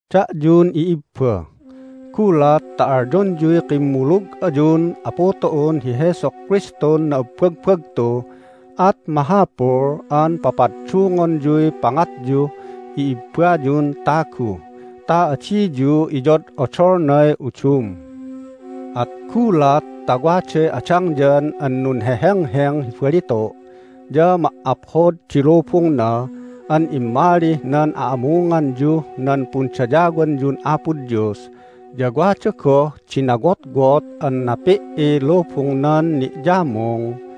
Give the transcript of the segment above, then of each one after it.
Da'yun i'ibba, gulat ta alyonyuy kimmulug ayun Apu tu'un hi Jesu Kristun na'abbagbagtu at mahapul an papaddungonyuy pangatyuh i'ibbayun tagu ta adiyu iyod'odolnay udum. At gulat ta waday adangyan an nunhehengheng hi balitu' ya ma"aphod di lubungna an immalih nan a'amunganyuh nan pundayawanyun Apo Dios ya wada goh di nawotwot an napi"iy lubungnan ni'yamung,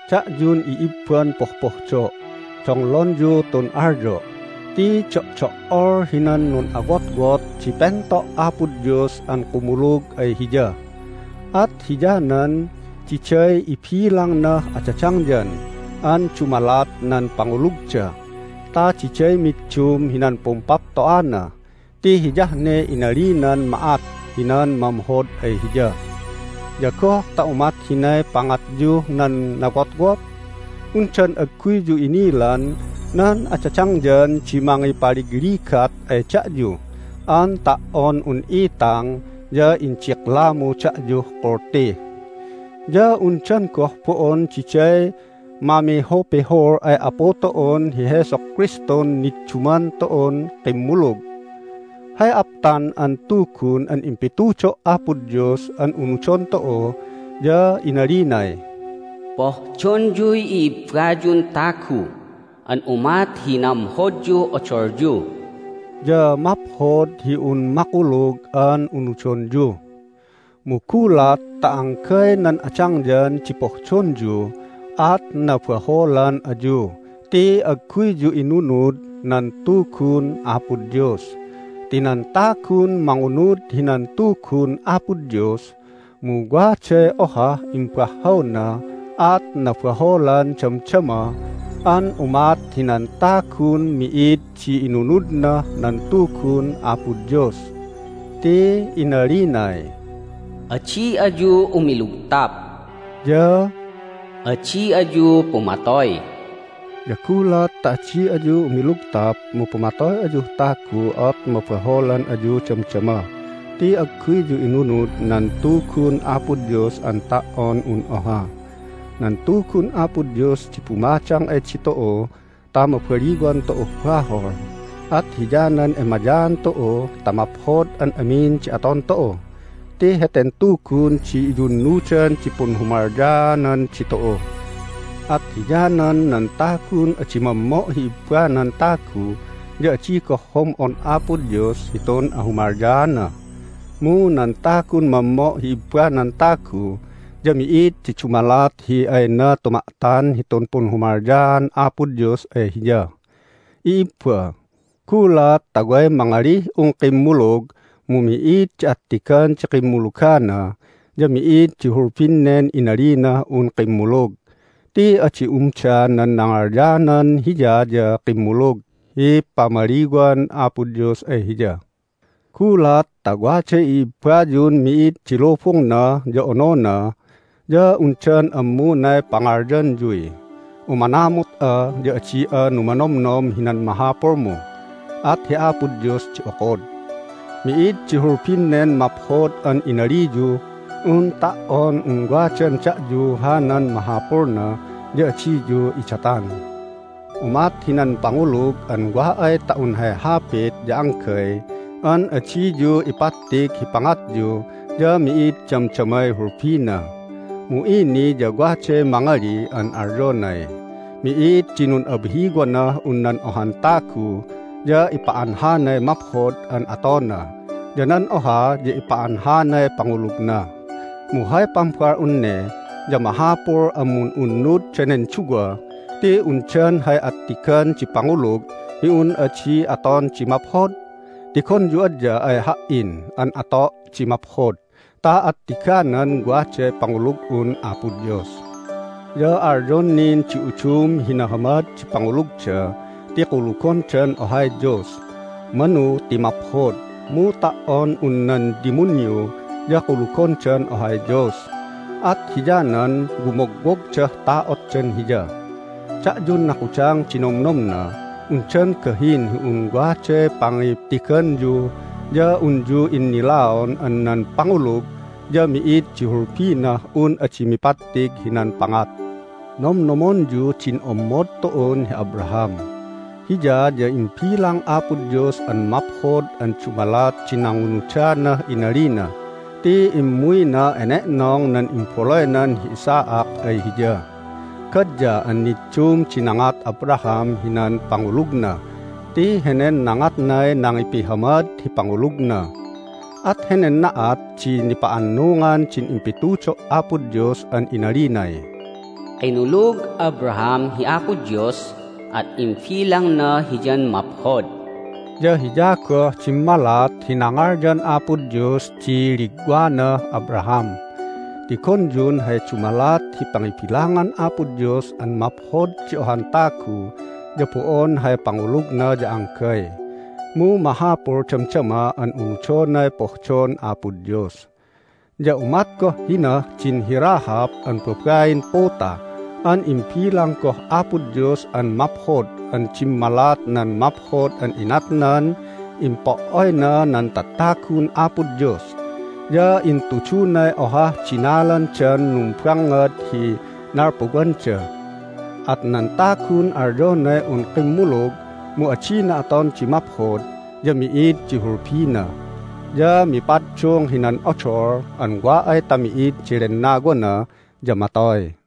Da'yun i'ibban pohpohdo', donglonyu tun alyo'! Ti do'do"ol hinan nun'awotwot di pento' Apo Dios an kumulug ay Hiya, at hiyanan diday ibilangnah adadangyan an dumalat nan pangulugda ta diday middum hinan pumpapto'ana ti hiyah ne inalinan ma'at hinan mamhod ay Hiya. Ya goh ta umat hinay pangatyuh nan nawotwot? Undan agguyyu inilan nan adadangyan di mangipaligligat ay da'yu an ta"on un itang ya indiklamu da'yuh kulti? Ya undan goh bo'on diday mamihupihul ay Apu tu'un hi Jesu Kristun nidduman tu'un kimmulug? Hay aptan an Tugun an impitudo' Apo Dios an unudon tu'u ya inalinay, "Pohdonyuy i'ibbayun tagu an umat hi namhodyuh odolyu." Ya maphod hi un makulug an unudonyu. Mu gulat ta anggay nan adangyan di pohdonyu at nabaholan ayu ti agguyyu inunud nan Tugun Apo Dios. Ti nan tagun mangunud hinan Tugun Apo Dios mu waday ohah imbahhawna at nabaholan damdama an umat hinan tagun mi'id di inunudnah nan Tugun Apo Dios. Ti inalinay, "Adi ayu umilugtap." ya "Adi ayu pumatoy." Ya gulat ta adi ayu umilugtap mu pumatoy ayuh tagu at mabaholan ayu damdama ti agguyyu inunud nan Tugun Apo Dios an ta"on un oha. Nan Tugun Apo Dios di bumadang ay ditu'u ta mabaliwan tu'uh bahol. At hiyanan emayaan tu'u ta maphod an amin di aton tu'u ti heten Tugun di iyunnudan di punhumalyaanan ditu'u. At hiyanan nan tagun adi mammo' hi ibbanan tagu ya adi goh hom'on Apo Dios hitun ahumalyaana. Mu nan tagun mammo' hi ibbanan tagu ya mi'id di dumalat hi ayna tuma'tan hitun punhumalyaan Apo Dios ay hiya. I'ibba, gulat ta way mangalih un kimmulug mu mi'id di attigan di kimmulugana ya mi'id di hulbin nen inalinah un kimmulug ti adi umda nan nangalyanan hiya ya kimmulug hi pamaliwan Apo Dios ay hiya. Gulat ta waday i'ibbayun mid di lubungna ya onona ya undan ammunay pangalyanyuy, "Umanamut'a, ya adi'a numanomnom hinan mahapulmu, at hi Apo Dios di okod." Mi'id di hulbin nen maphod an inaliyuh un ta"on un wadan da'yu hanan mahapulna ya adiyu idatan. Umat hinan pangulug an wa ay ta un hay hapit ya anggay an adiyu ipattig hi pangatyu ya mi'id damdamay hulbina. Mu ini ya waday mangili an alyonay, "Mi'id di nun'abhiwanah un nan ohan tagu ya ipa'anhanay maphod an atona ya nan oha ya ipa'anhanay pangulugna!" Mu hay pambal'un ne ya mahapul an mun'unnud danen duwa ti undan hay attigan di pangulug hi un adi aton di maphod? Tigonyu adya ay ha"in an ato' di maphod ta attiganan waday pangulug'un Apo Dios. Ya alyon nin di udum hi nahamad di pangulugda ti kulugondan ohay Dios. Manu ti maphod, mu ta"on un nan dimunyu ya kulugondan ohay Dios, at hiyanan wumogwogdah ta'otdan Hiya. Da'yun nakudang di nomnomna, undan gahin hi un waday pangittiganyu ya unyu innilaon an nan pangulug ya mi'id di hulbinah un adi mipattig hinan pangat? Nomnomonyu din ommod tu'un hi Abraham: Hiya ya imbilang Apo Dios an maphod an dumalat di nangunudanah inalina ti immuyna ene'nong nan imbaluynan hi Isaac ay Hiya. Gadya an niddum di nangat Abraham hinan pangulugna ti henen nangatnay nangipihamad hi pangulugna! At henen na'at di nipa'annungan din impitudo' Apo Dios an inalinay, "Kinulug Abraham hi Apo Dios, at imbilangna hiyan maphod." Ya hiya goh dimmalat hi nangalyan Apo Dios di ligwanah Abraham. Tigonyun hay dumalat hi pangibilangan Apo Dios an maphod di ohan tagu ya bo'on hay pangulugna ya anggay, mu mahapul damdama an unudonay pohdon Apo Dios. Ya umat goh hinah din hi Rahab an babain puta an imbilang goh Apo Dios an maphod an dimmalat nan maphod an inatnan impo"oyna nan tatagun Apo Dios, ya intudunay ohah dinalandan numbangngad hi nalpuwanda. At nan tagun alyonay un kimmulug mu adina aton di maphod ya mi'id di hulbina. Ya mipaddung hinan odol an wa ay ta mi'id di lennawana ya matoy.